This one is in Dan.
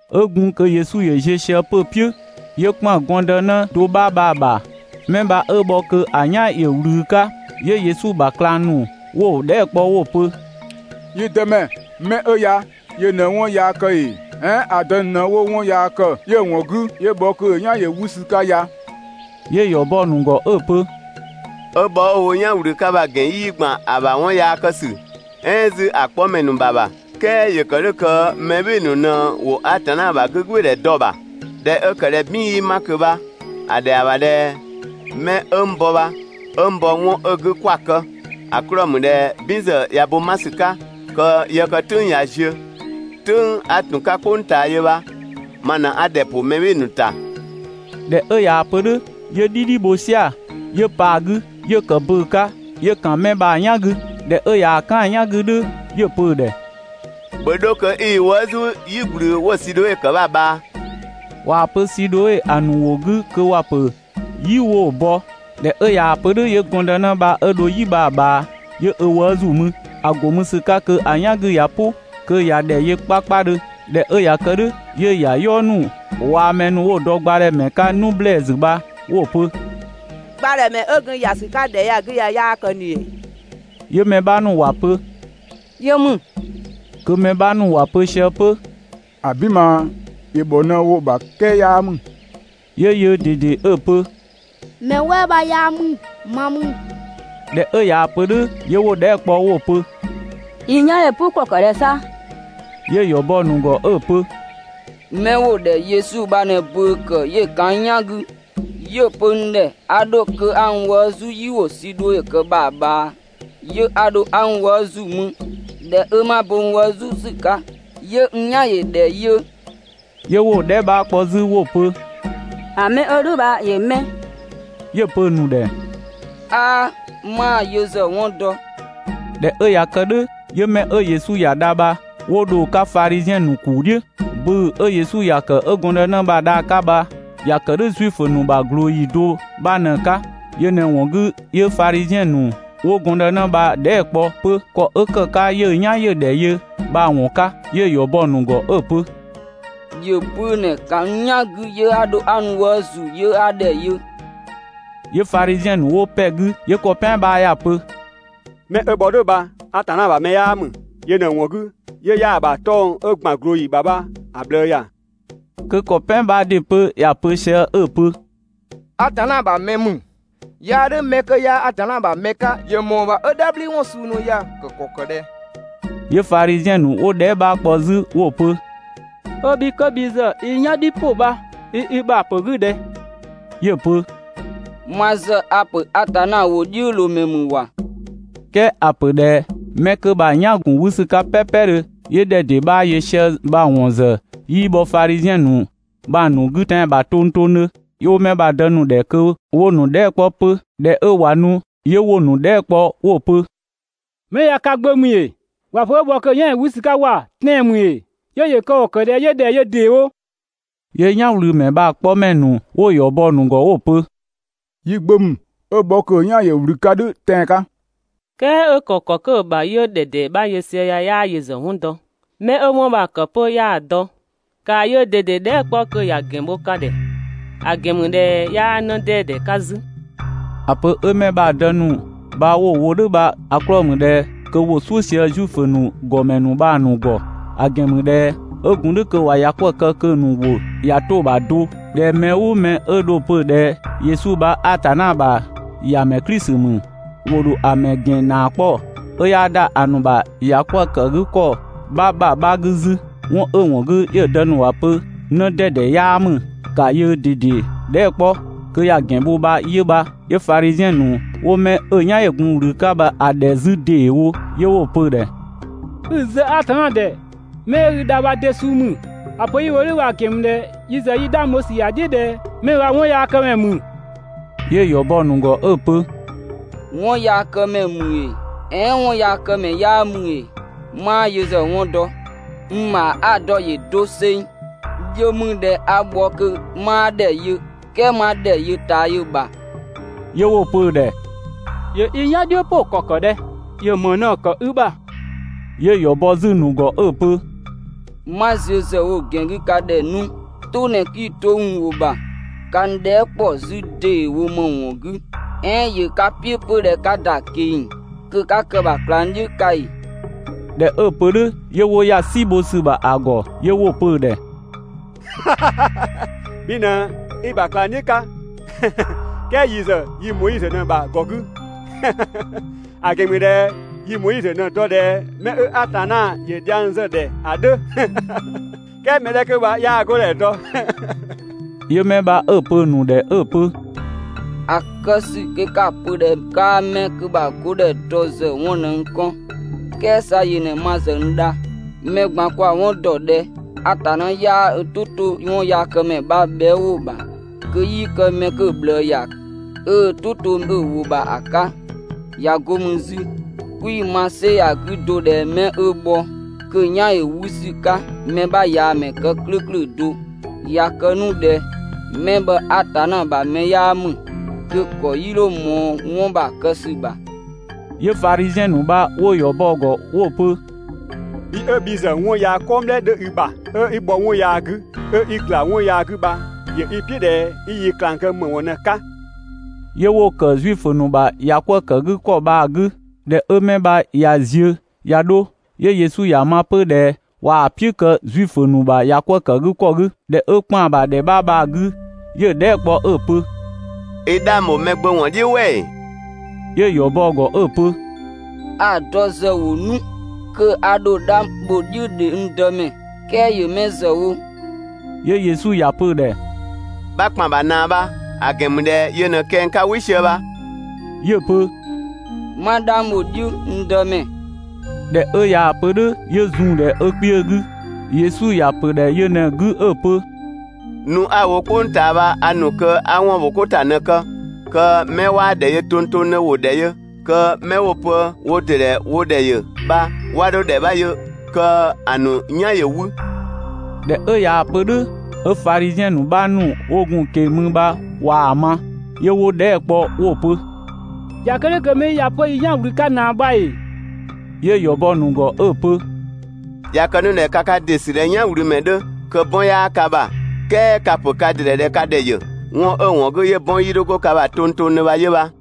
'Ö gun kö Yesu ‑yö ziö sië 'pö‑ "piʋ̈, 'yö ‑kpan gɔndënë do 'bha bha‑ ‑bha. 'Mɛ bha 'ö bhɔ kö‑ "yan ‑yö ꞊wlü 'ka. 'Yö Yesu ‑bha ꞊klang ‑nu 'wo‑ dhɛɛ" kpɔ 'wo‑ pö: «Yi Dëmɛ, 'mɛ 'ö ya yö ꞊në 'wɔn yaa ‑kë ‑ee, "ɛɛn ‑a dë ‑nu ꞊në 'wo 'wɔn yaa ‑kë 'yö‑ ‑wɔn 'gü 'yö bhɔ kö‑ "yan ‑yö 'wü ‑sü 'ka ya?» 'Yö‑ ‑yɔ bɔ‑ ‑nu ‑gɔ 'ö‑ pö: «'Ö bhɔ 'ö‑ wo "yan ꞊wlü 'ka bha‑ ‑gɛn 'yii ‑gban ‑a ‑bha 'wɔn yaa kë ‑sü, "ɛɛn 'zü ‑a 'kpɔmɛ ‑nu ‑bha ‑bha, "kɛɛ ‑yö ‑kë "dhʋ̈ kö mɛ "bhɩɩ‑ ‑nu ꞊në ‑wo Atanna ‑bha 'gügbɩɩdhɛ dɔ‑ ‑bha. ꞊Dhɛ 'ö ‑kë ꞊dhɛ "bin 'yii 'ma ꞊kö bha‑ ‑dhɛa ‑bha ꞊dhɛ mɛ 'ö n bɔ bha, 'ö n bɔ‑ 'wɔn 'ö‑ 'gü 'kwa‑ kë, ‑a 'klɔɔ‑ ‑mü ꞊dhɛ "bin ‑zë ꞊ya bo 'ma ‑sü 'ka, kö yë kë "tʋ̈ng ꞊ya ziö. "Tʋ̈ng 'a ‑tun 'ka "kpʋng ꞊taa yö bha ma ꞊në 'a ‑dhɛ ‑pʋ mɛ "bhɩɩ‑ ‑nu ‑ta.» ꞊Dhɛ 'ö ꞊yaa‑ pö "dhʋ̈ 'yö "dhidhi bho "sia‑, 'yö pa‑ 'gü, 'yö ‑kë bʋ̈ʋ̈‑ 'ka, 'yö‑ ‑kan 'mɛ bha‑ "yan 'gü. ꞊Dhɛ 'ö ꞊yaa‑ "kan‑ "yan 'gü "dhʋ̈ 'yö‑ pö‑ ‑dhɛ: «‑Bhö 'dho kö 'i i wëë' "zu "yi ꞊gblü 'wo‑ Sidhoe ‑kë bha‑ ꞊bhaa.» (꞊Waa‑ pö Sidhoe ‑a ‑nu ‑wʋ 'gü kö ‑wa pö "yi 'wo‑ bɔ). ꞊Dhɛ 'ö ꞊yaa‑ pö "dhʋ̈, 'yö gɔndënë bha 'ö dho "yi bha‑ ꞊bhaa, 'yö ö wëë' ‑zu mü. ‑A ‑go mü ‑sü 'ka kö‑ "yan 'gü ꞊ya "pʋ, kö ꞊ya ‑dhɛ yö 'kpakpadhö. ꞊Dhɛ 'ö ꞊ya kë "dhʋ̈, 'yö‑ ‑yayɔɔ ‑nu waa‑ 'mɛ 'wo‑ dɔ gbadhɛmɛ 'ka 'nu ‑blɛɛsü bha 'wo‑ pö: «Gbadhɛmɛ 'ö gun ‑ya ‑sü 'ka ‑dhɛ 'ya‑ 'gü ya 'yaa kë ꞊ni ‑ee?» 'Yö mɛ 'bha ‑nu ‑wa pö: «Yö ‑mü.» Kö mɛ 'bha ‑nu ‑wa pö sië 'pö: «‑Abin ꞊maa, ‑yö ‑bhɔ ꞊në wo‑ ‑bha "kɛɛ 'yaa ‑mü!» 'Yö yöö ꞊dede 'ö‑ pö: «Mɛ "wɛɛ 'bha 'yaa ‑mü, ma ‑mü!» ꞊Dhɛ 'ö ꞊yaa‑ pö "dhʋ̈, 'yö 'wo‑ dhɛɛ" kpɔ 'wo‑ pö: «I "yan ‑yö "pʋ ‑kɔ ‑kë ꞊dhɛ 'sa?» 'Yö‑ ‑yɔ bɔ‑ ‑nu ‑gɔ 'ö‑ pö: «'Mɛ 'wo‑ ‑dhɛ Yesu bha ꞊në bʋ̈ʋ̈‑ ‑kë 'yö‑ ‑kan n "yan 'gü, 'yö‑ pö n ‑dhɛ 'a 'dho kö 'a n wëë' "zu "yi 'wo‑ Sidhoe ‑kë bha‑ ꞊bhaa, 'yö 'a 'dho 'a n wëë' ‑zu mü. ꞊Dhɛ 'ö 'ma bo n wëë' "zu ‑sü 'ka, 'yö n "yan ‑yö ‑dhɛ yö.» 'Yö 'wo‑ dhɛɛ" 'bha kpɔ 'zü 'wo‑ pö: «‑A 'mɛ 'ö "dhʋ̈ bha ‑yö 'mɛ?» 'Yö‑ pö‑ ‑nu ‑dhɛ: «'Aa! 'maa‑ yö ‑zë 'wɔn dɔ!» ꞊Dhɛ 'ö ꞊ya kë "dhʋ̈, 'yö 'mɛ 'ö Yesu ‑ya dha bha 'wo dho‑ 'ka Fadhiziɛn ‑nu ‑kuu "dhiʋ̈. Bʋ̈ʋ̈‑ 'ö Yesu ‑ya ‑kë 'ö gɔndënë bha‑ dha‑ 'ka bha ‑ya ‑kë "dhʋ̈ Zuifö ‑nu ‑bha ꞊glooyi do 'bha ꞊në‑ 'ka. Yö ꞊në‑ ‑wɔn 'gü 'yö Fadhiziɛn ‑nu 'wo gɔndënë bha‑ dhɛɛ" kpɔ 'pö ‑kɔ 'ö ‑kë 'ka 'yö‑ "yan ‑yö ‑dhɛ yö bha‑ ‑wɔn 'ka. 'Yö‑ ‑yɔ bɔ 'pö‑ ‑nu ‑gɔ 'ö‑ pö: «‑Yö bʋ̈ʋ̈‑ ꞊në‑ ‑kan n "yan 'gü 'yö 'a dho 'a n wëë' ‑zu 'yö 'a ‑dhɛ yö.» 'Yö Fadhiziɛn ‑nu 'wo ‑pɛ 'gü, 'yö ‑kɔ "pɛan bha ‑ya pö: «'Mɛ 'ö bhɔ "dhʋ̈ bha Atanna ‑bha mɛ 'yaa ‑mü; yö ꞊në‑ ‑wɔn 'gü 'yö 'yaa‑ ‑bha 'tɔng‑ 'ö‑ ‑gban ꞊glooyi ‑bha bha‑ ꞊bhlëë ‑ya.» Kö ‑kɔ "pɛan 'bha ‑dɩ 'pö ‑ya pö sië 'ö‑ pö: «Atanna ‑bha mɛ ‑mü! 'Yaa "dhʋ̈ 'mɛ 'kö 'yaa Atanna ‑bha mɛ 'ka ‑yö ‑mɔɔ ‑bha 'ö "dhabhliwɔn suu ‑nu ya‑ kë ‑kɔ ‑kë ꞊dhɛ?» 'Yö Fadhiziɛn ‑nu 'wo‑ dhɛɛ" 'bha kpɔ 'zü 'wo‑ pö: «'Ö bhi 'kö bhi ‑zë i "yan "dhiʋ̈ ‑pʋ bha i i ‑bha ‑pö 'gü ꞊dhɛ?» 'Yö‑ pö: «Ma ‑zë a‑ ‑pö Atanna ‑wʋdhiʋ̈loomɛ ‑mü ‑wa!» "Kɛɛ ‑a ‑pö ꞊dhɛ 'mɛ 'kö bha‑ "yan‑ ‑gun 'wü ‑sü 'ka "pɛɛpɛdhö 'yö ‑dhɛ ‑dee 'bha yö sië bha‑ ‑wɔn ‑zë 'yii bhɔ Fadhiziɛn ‑nu bha‑ ‑nu 'gü tɛan‑ ‑bha tongtongdhö. 'Yö 'wo 'mɛ bha‑ dë ‑nu ‑dhɛ kö 'wo‑ ‑nu dhɛɛ" 'kpɔ 'pö. ꞊Dhɛ 'ö ꞊wa nu, 'yö 'wo‑ ‑nu dhɛɛ" kpɔ 'wo‑ pö: «'Mɛ ya ka gbö ‑mü ‑ee? ‑Wa ‑pö 'ö bhɔ kö‑ "yan ‑yö 'wü ‑sü 'ka ‑wa, tɛan‑ ‑mü ‑ee? 'Yö ‑yö kë ‑kɔ ‑kë ꞊dhɛ 'yö ‑dhɛ yö ‑deewo?» 'Yö "yanwlümɛ bha‑ 'kpɔmɛ ‑nu bha 'wo‑ ‑yɔ bɔ‑ ‑nu ‑gɔ 'wo‑ pö: «Yi gbö ‑mü, 'ö bhɔ kö‑ "yan ‑yö ꞊wlü 'ka "dhʋ̈ tɛan‑ 'ka, "kɛɛ 'ö ‑kë ‑kɔ 'kö‑ ‑bha 'yö ‑dhɛ ‑dee 'bha yö sië ya 'yaa yö ‑zë 'wɔn dɔ, 'mɛ 'ö 'wɔn bha‑ ‑kë 'pö 'yaa‑ dɔ. ‑Kaa yöö ꞊dede dhɛɛ" 'kpɔ kö ‑ya ‑gɛn bho ka ‑dhɛ, ‑a ‑gɛn ‑mü ꞊dhɛ 'yaa 'në 'dɛdɛ 'ka 'zü!» ‑A pö 'ö 'mɛ bha‑ dë ‑nu bha ‑wa wo "dhʋ̈ bha‑ 'klɔɔ‑ ‑mü ꞊dhɛ kö ‑wo "suʋ̈ sië Zuifö ‑nu ‑gɔmɛ ‑nu bha‑ ‑nu ‑gɔ; ‑a ‑gɛn ‑mü ꞊dhɛ 'ö gun "dhʋ̈ kö ꞊wa ‑ya 'kwëë‑ kë kö‑ ‑nu ‑wʋ ꞊ya 'to‑ ‑bha do ꞊dhɛ mɛ "ʋʋ mɛ 'ö dho‑ pö ꞊dhɛ Yesu bha Atanna ‑bha ‑Yamɛ Klisi ‑mü, ‑wo ‑dho a‑ ‑mɛ ‑gɛn ‑naa 'kpɔ, 'ö 'yaa ‑da ‑a ‑nu ‑bha ‑yakwëëkëgükɔ 'bha ‑bha 'bha 'gü 'zü. 'Wɔn 'ö‑ ‑wɔn 'gü 'yö‑ dë ‑nu ‑wa pö 'në 'dɛdɛ 'yaa ‑mü, ‑kaa yöö ꞊dede dhɛɛ" 'kpɔ kö ‑ya ‑gɛn bho bha 'yö bha. 'Yö Fadhiziɛn ‑nu 'wo 'mɛ 'ö "yan ‑yö gun ꞊wlü 'ka bha‑ ‑dhɛ 'zü ‑deewo, 'yö 'wo‑ pö‑ ‑dhɛ: «'i‑ zë Atanna ‑dhɛ! 'Mɛ 'ö i dha bha de suu ‑mü? ‑A pö 'yi‑ wo "dhʋ̈ bha‑ ‑gɛn ‑mü ꞊dhɛ yi ‑zë yi 'dhang bho ‑sü ‑ya "dhiʋ̈ ꞊dhɛ 'mɛ bha 'wɔnyaakëmɛ ‑mü.» 'Yö‑ ‑yɔ bɔ‑ ‑nu ‑gɔ 'ö‑ pö: «'Wɔnyaakëmɛ ‑mü ‑ee, "ɛɛn 'wɔnyaakëmɛ 'yaa ‑mü ‑ee, 'maa yö ‑zë 'wɔn dɔ! N ‑bha 'a‑ dɔ ‑yö doseng, yö ‑mü ꞊dhɛ 'a bhɔ kö 'maa ‑dhɛ yö "kɛɛ 'ma ‑dhɛ yö ꞊taa yö‑ ‑bha.» 'Yö 'wo‑ pö‑ ‑dhɛ: «‑Yö i "yan "dhiʋ̈ "pʋ ‑kɔ kë ꞊dhɛ? ‑Yö ‑më ꞊në‑ ‑kë i ‑bha?» 'Yö‑ ‑yɔ bɔ 'zü‑ ‑nu ‑gɔ 'ö‑ pö: «'Ma ziö ‑zë wo‑ ‑gɛn 'gü ka ‑dhɛ 'nu, "tʋ ꞊në 'kii‑ 'to n ‑wʋ ‑bha, ka n dhɛɛ" ‑kpɔ 'zü ‑deewo ‑më ‑wɔn 'gü? "Ɛɛn ‑yö ka "piʋ̈ 'pö ꞊dhɛ 'ka ‑da ꞊keng‑ kö 'ka kë‑ ‑bha ꞊klangdhiʋ̈ 'ka ‑ee?» ꞊Dhɛ 'ö‑ pö "dhʋ̈ 'yö 'wo ‑ya "si bho ‑sü ‑bha ‑a ‑gɔ, 'yö 'wo‑ pö‑ ‑dhɛ: «Bhi ꞊në 'i‑ ‑bha ꞊klangdhiʋ̈ 'ka, "kɛɛ yi ‑zë yi Moizö ꞊në‑ ‑bha ‑gɔ 'gü. ‑A ‑gɛn ‑mü ꞊dhɛ yi Moizö ꞊në‑ dɔ ꞊dhɛ 'mɛ 'ö Atanna ‑yö dhiang zë‑ ‑dhɛ ‑a 'dhö, "kɛɛ mɛ 'dhɛ 'kö bha 'yaa‑ 'godhɛ dɔ.» 'Yö 'mɛ bha 'ö‑ pö‑ ‑nu ‑dhɛ 'ö‑ pö: «‑A kë ‑sü kö 'ka‑ pö ꞊dhɛ 'kaa 'mɛ 'kö bha‑ 'godhɛ dɔ ‑zë 'wɔn ꞊në n kɔn, "kɛɛ 'sa yö ꞊në ma ‑zë n dha. Mɛ ꞊gban kwa‑ 'wɔn ‑dɔ ꞊dhɛ Atanna 'yaa ö "tʋ 'to 'wɔnyaakëmɛ ‑bha bhɛa" ‑wʋ ‑bha kö 'yii kë 'mɛ kö‑ ꞊bhlëë ‑ya, 'ö ö "tʋ to‑ ‑wʋ ‑bha ‑a 'ka. ꞊Ya 'go ‑mü 'zü 'kwii‑ ‑ma "sɛ ya‑ 'gü do ꞊dhɛ 'mɛ 'ö bhɔ kö‑ "yan ‑yö 'wü ‑sü 'ka mɛ 'bha ꞊yaa‑ ‑mɛ kë "klʋ̈ʋ̈klʋ̈ do. ꞊Ya kë 'nu ꞊dhɛ 'mɛ bha Atanna ‑bha mɛ 'yaa ‑mü, kö‑ ‑kɔ 'yii 'dho ꞊mɔɔ 'wɔn bha‑ kë ‑sü ‑bha!» 'Yö Fadhiziɛn ‑nu bha 'wo‑ ‑yɔ bɔ‑ ‑gɔ 'wo‑ pö: «Bhi 'ö bhi ‑zë 'wɔn yaa "kɔngblɛ 'dhö i ‑bha, 'ö 'i bhɔ 'wɔn yaa 'gü, 'ö 'i ‑gla 'wɔn yaa 'gü bha ‑yö i "piʋ̈ ꞊dhɛ 'i yi ꞊klang kë ‑më ‑wɔn ꞊në‑ 'ka?» 'Yö 'wo‑ ‑kë Zuifö ‑nu ‑bha ‑yakwëëkëgükɔ bha‑ 'gü. ꞊Dhɛ 'ö 'mɛ bha ꞊ya ziö ꞊ya 'dho, 'yö Yesu ‑ya ma 'pö ꞊dhɛ ꞊waa‑ "piʋ̈ kë Zuifö ‑nu ‑bha ‑yakwëëkëgükɔ 'gü. ꞊Dhɛ 'ö ‑kpan ‑bha ‑dhɛ 'bha bha‑ 'gü, 'yö‑ dhɛɛ" kpɔ 'ö‑ pö: «I 'dhang ‑bho Mɛgbömɛ ‑wɔn "dhiʋ̈ "wɛ ‑ee?» 'Yö‑ ‑yɔ bɔ‑ ‑gɔ 'ö‑ pö: «A‑ dɔ ‑zë wo 'nu kö a ‑dho 'dhang bho‑ "dhiʋ̈ ‑dhe, n Dëmɛ! "Kɛɛ ‑yö 'mɛ ‑zë wo?» 'Yö Yesu ‑ya pö‑ ‑dhɛ: «'Bha ‑kpan ‑bha ꞊naa bha, ‑a ‑gɛn ‑mü ꞊dhɛ yö ꞊në kɛng 'ka "wɩ sië bha.» 'Yö‑ pö: «'Ma 'dhang bho‑ "dhiʋ̈, n Dëmɛ!» ꞊Dhɛ 'ö ꞊yaa‑ pö "dhʋ̈, 'yö zun‑ ‑dhɛ ö kpiö 'gü. Yesu ‑ya ‑pö ‑dhɛ yö ꞊në‑ 'gü 'ö‑ pö: «Nu 'a‑ wo "kpʋng ꞊taa bha a ‑nu kö 'a 'wɔnbhokota ꞊në‑ kë kö 'mɛ 'waa ‑dhɛ yö tongtongdhö ‑wo ‑dhɛ yö, kö 'mɛ 'wo‑ pö wo ‑dɩ ‑dhɛ wo ‑dhɛ yö bha 'wa 'dho ‑dhɛ 'bha yö, kö‑ ‑nu "yan ‑yö 'wü.» ꞊Dhɛ 'ö ꞊yaa‑ pö "dhʋ̈ 'ö Fadhiziɛn ‑nu 'bha ‑nu 'wo gun‑ ꞊keng‑ mü bha ꞊waa‑ ma, 'yö 'wo‑ dhɛɛ" kpɔ 'wo‑ pö: «꞊Ya kë "dhʋ̈ kö 'mɛ 'yi ya 'pö yi "yan‑ ꞊wlü 'ka ꞊naa bha ‑ee?» 'Yö‑ ‑yɔ bɔ‑ ‑nu ‑gɔ 'ö‑ pö: «꞊Ya kë 'nu ꞊dhɛ ka ka ‑dɩ ‑sü ꞊dhɛ "yanwlümɛ 'dhö kö 'bɔn 'yaa ka ‑bha, "kɛɛ ka‑ ‑pö ka ‑dɩ ‑dhɛ ꞊dhɛ ka ‑dhɛ ‑yö; 'wɔn 'ö‑ ‑wɔn 'gü 'yö 'bɔn 'yii 'dho 'go ka ‑bha tongtongdhö bha 'yö bha.»